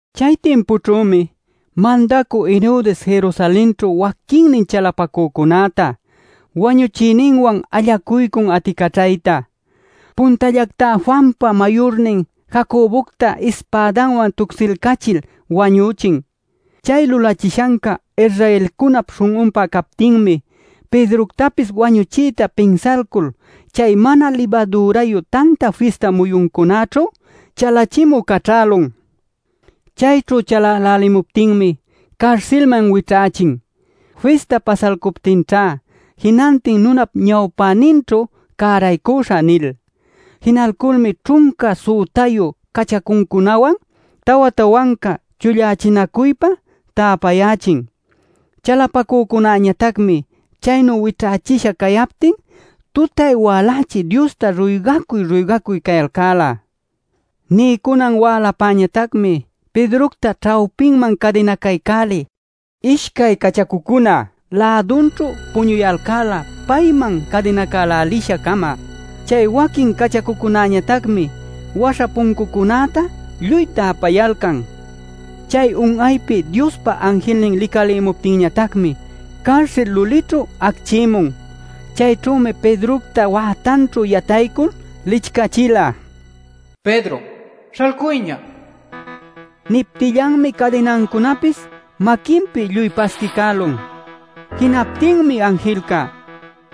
Chay timpućhümi mandacü Herodes Jerusalenćhu waquinnin chalapacücunäta, wañuchiyninwan allacuycun aticaćhayta. Puntallactá Juanpa mayurnin Jacobocta ispädawan tucsilcachil wañüchin. Chay lulachishanca Israelcunap śhun'unpä captinmi Pedroctapis wañuchiyta pinsalcul chay Mana Libadürayu Tanta Fista muyuncunäćhu chalachimü caćhälun. Chayćhu chalälälimuptinmi carsilman wićhächin: “Fista pasalcuptinćha jinantin nunap ñawpäninćhu cäraycuśhä” nil. Jinalculmi ćhunca sütayu cachacuncunawan tawa-tawanca chullächinacuypa täpayächin. Chalapacücunäñatacmi chaynu wićhächisha cayaptin tutay-walächi Diosta ruygacuy-ruygacuy cayalcäla. Niycunan wälapäñatacmi Pedrocta ćhawpiman cadinacaycälil ishcay cachacucuna lädunćhu puñupayalcan payman cadinacälälisha-cama. Chay waquin cachacucunañatacmi waśha puncucunäta lluy täpayalcan. Chay un'aypi Diospa anjilnin licalimuptinñatacmi carsil lulićhu acchïmun. Chayćhümi Pedrocta wätanćhu yataycul licchachila: “¡Pedro, śhalcuyña!” nil. Niptillanmi cadinancunapis maquinpi lluy pasquicälun. Jinaptinmi anjilca: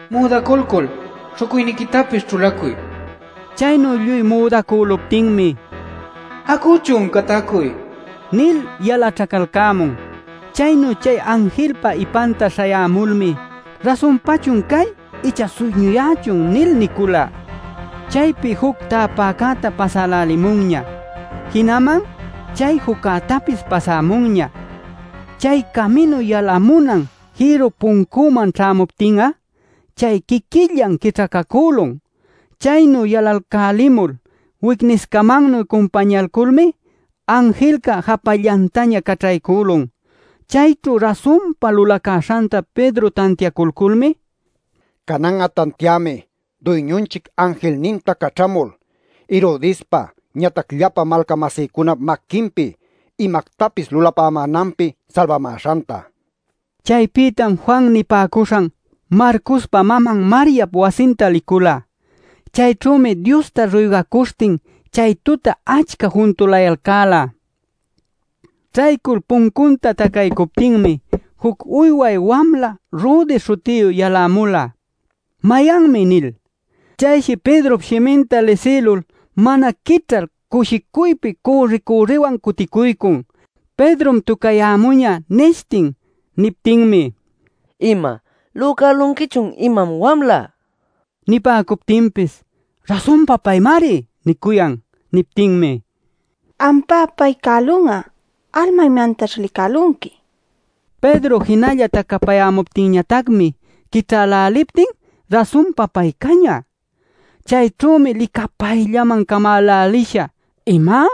“Müdaculcul śhucuyniquitapis ćhulacuy” nin. Chaynu lluy müdacüluptinmi: “¡Acuchun, catacuy!” nil yalaćhacalcämun. Chaynu chay anjilpa ipanta śhayämulmi: “¿Rasunpachun cay icha suyñuyächun?” nil nicula. Chaypi juc täpäcäta pasälälimunña, jinaman chay juccätapis pasämunña. Chay caminu yalamuna jïrru puncüman ćhämuptin'a, chay quiquillan quićhacacülun. Chaynu yalalcälimul wicniscamannuy cumpañayculmi anjilca japallantaña caćhaycülun. Chayćhu rasunpa lulacäśhanta Pedro tantiaculculmi: “Canan'a tantiämi Duyñunchic anjilninta caćhamul, Herodespa ñatac llapa malca-masïcunap maquinpi imactapis lulapämänanpi salbamäśhanta” nin. Chaypïtam Juan nipäcuśhan Marcospa maman Mariap wasinta licula. Chayćhümi Diosta ruygacuśhtin chay tuta achca juntulayalcäla. Ćhaycul puncunta tacaycuptinmi juc uyway wamla Rode śhutiyu yalämula: “¿Mayanmi?” nil. Chayshi Pedrop shiminta lisïlul mana quićhal cushicuypi cürri-cürriywan cuticuycun: “¡Pedrom tucayämuñä!” nishtin. Niptinmi: “¿Ima? ¿Lücälunquichun imam, wamla?” nicuyalcan. Nipäcuptinpis: “¡Rasunpa paymari!” nicuyan. Niptinmi: “Ampá, pay cälun'a. Alma imantaćh licälunqui” nipäcun. Pedro jinalla tacapayämuptinñatacmi quićhäläliptin rasunpa pay cañä. Chayćhümi licapayllaman camälälisha: “¿Ima?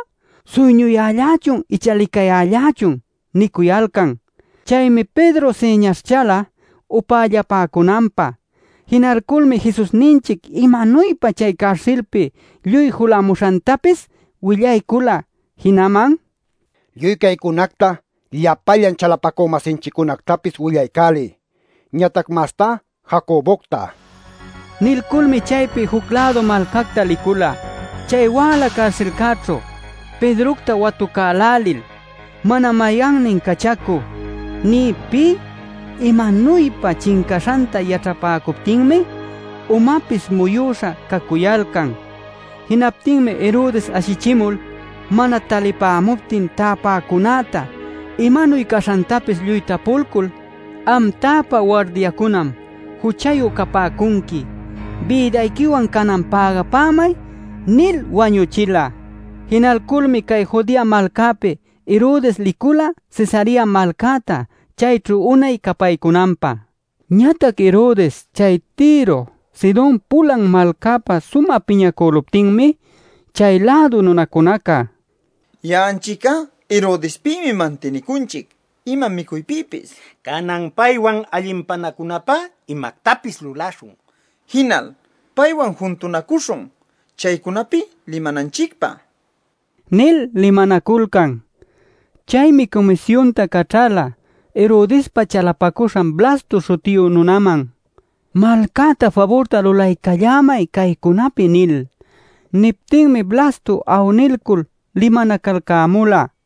¿Suyñuyällachun icha licayällachun?” nicuyalcan. Chaymi Pedro siñaśhchala upällapäcunanpä. Jinalculmi Jesusninchic imanuypa chay carsilcäpi lluy julamuśhantapis willaycula. Jinaman: “Lluy caycunacta llapallan chalapacü-masinchiccunactapis willaycäliy, ñatac mastá Jacobocta” nila. Nilculmi chaypi juc-lädu malcacta licula. Chay wäla carsilcäćhu Pedrocta watucälälil mana mayannin cachacu nï pï imanuypa chincaśhanta yaćhapäcuptinmi umapis muyüśha cacuyalcan. Jinaptinmi Herodes ashichimul mana talipämuptin täpäcunäta imanuy caśhantapis lluy tapulcul: “Am täpä wardiacunam juchayu capäcunqui. ¡Bïdayquiwan canan pägapämay!” nil wañüchila. Jinalculmi cay Judea malcäpi Herodes licula Cesarea malcäta chayćhu unay capaycunanpä. Ñatac Herodes chay Tiro, Sidon pulan malcäpä sumä piñacüluptinmi chay-lädu nunacunaca: “Ya'anchic'a Herodespïmi mantinicunchic ima micuypïpis. Canan paywan allinpanacunapä imactapis lulaśhun, jinal paywan juntunacuśhun chaycunapi limananchicpä” nil limanaculcan. Chaymi cumisyunta caćhala Herodespa chalapacuśhan Blasto śhutiyu nunanman: “Malcäta faburta lulaycallämay caycunapi” nil. Niptinmi Blasto awnilcul limanacalcämula.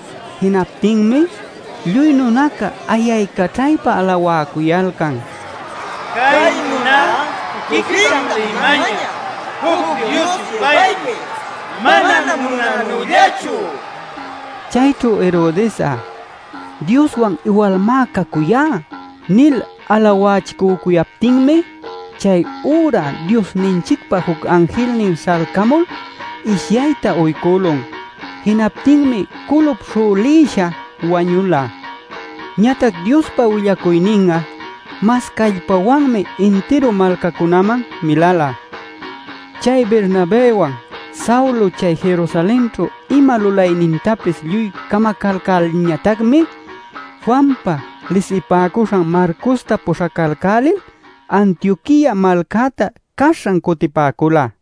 Jinaptinmi lluy nunaca ayaycaćhaypa alawäcuyalcan: “Cay nuná tuquictam limañä juc dios-yupaypis; manam nunanüllachu” nil. Chayćhu Herodes'a “Dioswan iwalmá cacuyá” nil alawachicücuyaptinmi chay üra Diosninchicpa juc anjilnin śhalcamul ishyayta uycülun. Jinaptinmi culup śhülïsha wañula. Ñatac Diospa willacuynin'a mas callpawanmi intiru malcacunäman milala. Chay Bernabëwan, Saulo chay Jerusalenćhu ima lulaynintapis lluy camacalcälilñatacmi, Juanpa lisipäcuśhan Marcosta puśhacalcälil Antioquia malcäta caśhan cutipäcula.